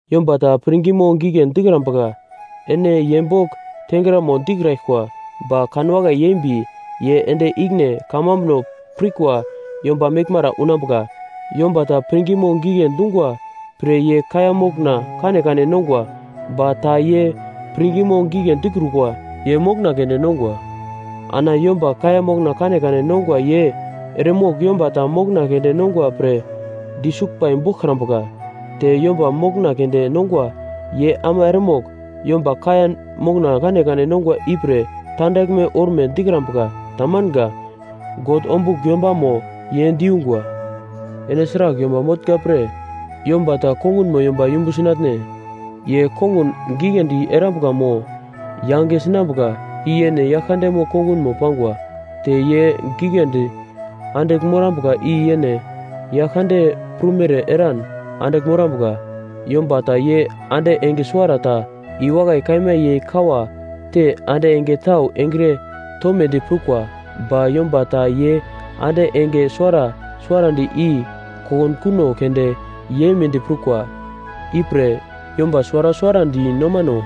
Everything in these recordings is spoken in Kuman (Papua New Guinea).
Yomba ta pirngimo gigle dikrambuka, ene ye bogl tengramo dikraglkwa ba kanwakai yeimbi ye ende ikine kamambuno pirkwa yomba meglmara unambuka. Yomba ta pirngimo gigle dungwa pre ye kaiya mokna kanekane nongwa. Ba ta ye pirngimo gigle dikrukwa, ye mokna keunde nongwa. Ana yomba kaiya mokna kanekane nongwa ye eremogl yomba ta mokna keunde nongwa pre disuglbai boglkrambuka. Te yomba mokna keunde nongwa ye ama eremogl yomba kaiya mokna kanekane nongwa ipre tandaglme orme dikrambuka. Tamanga. God ombugl yombamo ye diyungwa. Ene sragl yomba motnga pre yomba ta kongunmo yomba yumbu sinatne? Ye kongun giglendi erambuka mo yange sinambuka, i yene yagl kandemo kongunmo pangwa. Te ye giglendi andigl morambuka i yene Yaglkande prumere eran andigl morambuka. Yomba ta ye ande enge suwarata i wakai kaima yei kawa te ande enge tau engre tomedi prukwa. Ba yomba ta ye ande enge suwara suwarandi i kokunkuno keunde yeimedi prukwa. Ipre yomba suwara suwarandi nomano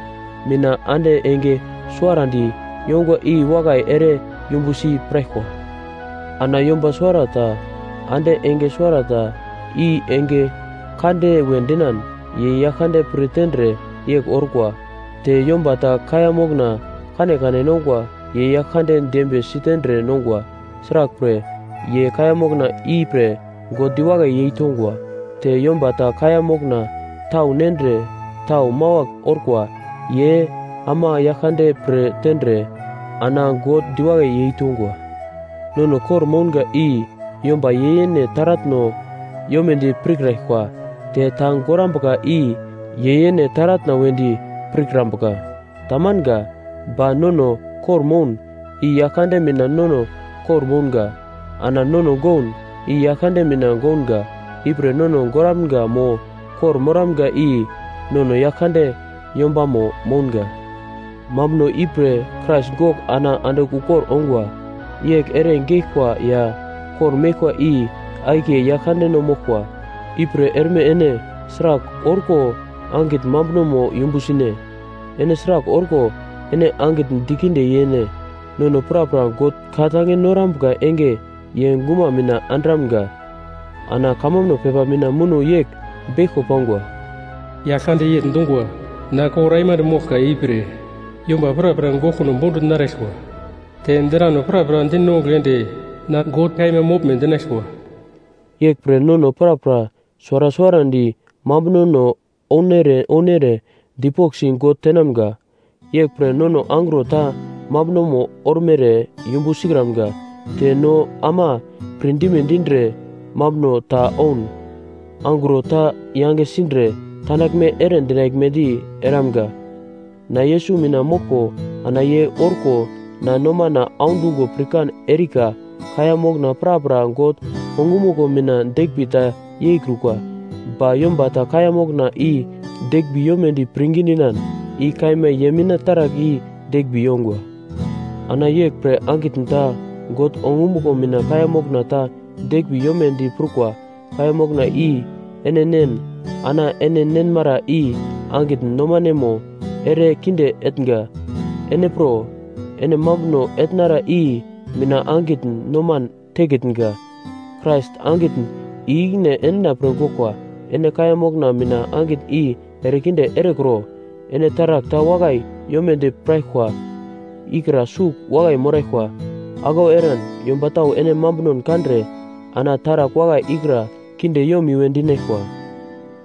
mina ande enge suwarandi yongwa i wakai ere yumbusi piraglkwa. Ana yomba suwarata ande enge suwarata i enge kande we dinan, ye Yaglkande pir tendre yegl orkwa. Te yomba ta kaiya mokna kanekane nongwa. Ye Yaglkande dembiye sitendre nongwa, sraglpre, ye kaiya mokna ipre God diwakai yei tongwa. Te yomba ta kaiya mokna tau nendre tau mawagl orkwa. Ye ama Yaglkande pir tendre, ana God diwakai yeitongwa. Nono kor-mounga i yomba ye yene taratno yomedi pirkraglkwa. Te ta gorambuka i ye yene taratna wedi pirkrambuka. Tamanga. Ba nono kor-moun, i Yaglkande mina nono kor-mounga. Ana nono goun, i Yaglkande mina gounga. Ipre nono goramga mo kor-moramga i nono Yaglkande yombamo mounga. Mambuno ipre Krais gogl ana andigl ukor ongwa. Yegl ere geglkwa ya kor-meglkwa i akiye Yaglkandeno moglkwa. Ipre erme ene sragl orko angitn mambunomo yumbu sine? Ene sragl orko ene angitn dikinde yene? Nono prapra God ka-tange norambuka enge ye guma mina andramga. Ana kamambuno pepa mina muno yegl beglko pangwa: “Yaglkande yegl dungwa, ‘Na kor aimande moglka; ipre yomba prapra goglkuno bondugl naraglkwa; te drano prapra dinongugl ende na God kaima moglme dinaglkwa.’” Yeglpre nono prapra suwara suwarandi mambunono ounere ounere dipoglsi God tenamga. Yeglpre nono angro ta mambunono ormere yumbu sikramga. Te no ama pir dime dindre mambuno ta oun, angro ta yange sindre tandaglme ere dinaglmedi eramga. Na Yesus mina moglko ana ye orko na nomana audungo pirkan erika kaiya mokna prapra God ongumuglo mina deglmbi ta yeikrukwa. Ba yomba ta kaiya mokna i deglmbi yomedi pirngi dinan, i kaima ye mina taragl i deglmbi yongwa. Ana yeglpre angitn ta God ongumuglo mina kaiya mokna ta deglmbi yomedi prukwa kaiya mokna i ene nen ana ene nenmara i angitn nomanemo ere kinde etnga. Ene pro, ene mambuno etnara i mina angitn noman tekitnga. Krais angitn i-ikine endina pre goglkwa, ene kaiya mokna mina angitn i erekinde erekro. Ene taragl ta wakai yomedi piraglkwa ikra sugl wakai moraglkwa, aglau eran yomba tau ene mambunon kandre ana taragl wakai ikra kinde yomiwe dinaglkwa.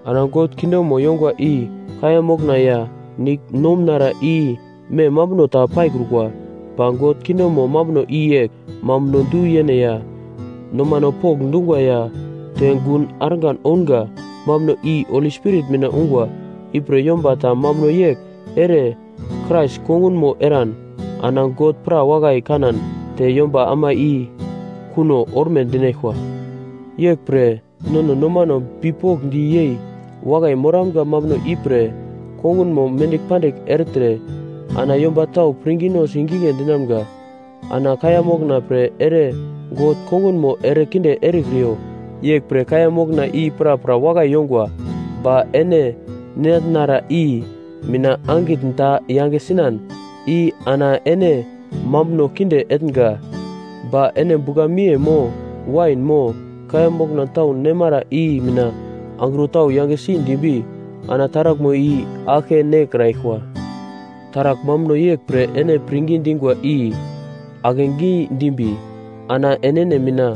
Ana God kingdomo yongwa i kaiya mokna ya nigl nomunara i mem mambuno ta paikrukwa, ba God kingdomo mambuno i yegl; mambuno du-yene ya, nomano pokndungwa ya, te gun argan ounga, mambuno i Holi Spirit mina ungwa. Ipre yomba ta mambuno yegl ere Krais kongunmo eran, ana God pra wakai kanan te yomba ama i kuno orme dinaglkwa. Yeglpre nono nomano bipokndi yei wakai moramga mambuno ipre kongunmo mendigl pandigl ertre, ana yomba tau pirngino sigigle dinamga. Ana kaiya mokna pre ere God kongunmo erekinde erekriyo. Yeglpre kaiya mokna i prapra wakai yongwa, ba ene ninatnara i mina angitn ta yange sinan, i ana ene mambuno kinde etnga. Ba ene bugla-miye mo wain mo kaiya mokna tau nemara i mina angro tau yangesi dimbi, ana taraglmo i aglke nekraglkwa. Taragl mambuno yeglpre ene pirngi dingwa i akegi dimbi ana enene mina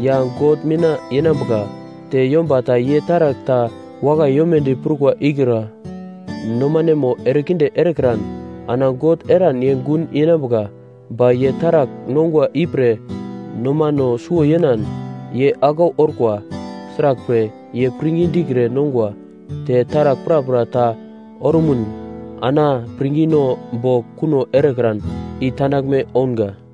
ya God mina yenambuka. Te yomba ta ye taragl ta wakai yomedi prukwa ikra nomanemo erekinde erekran, ana God eran ye gun yenambuka. Ba ye taragl nongwa ipre nomano suwo yenan, ye aglau orkwa. Sraglpre, ye pirngi dikre nongwa. Te taragl prapra ta orumun ana pirngino bogl kuno erekran, i tandaglme ounga.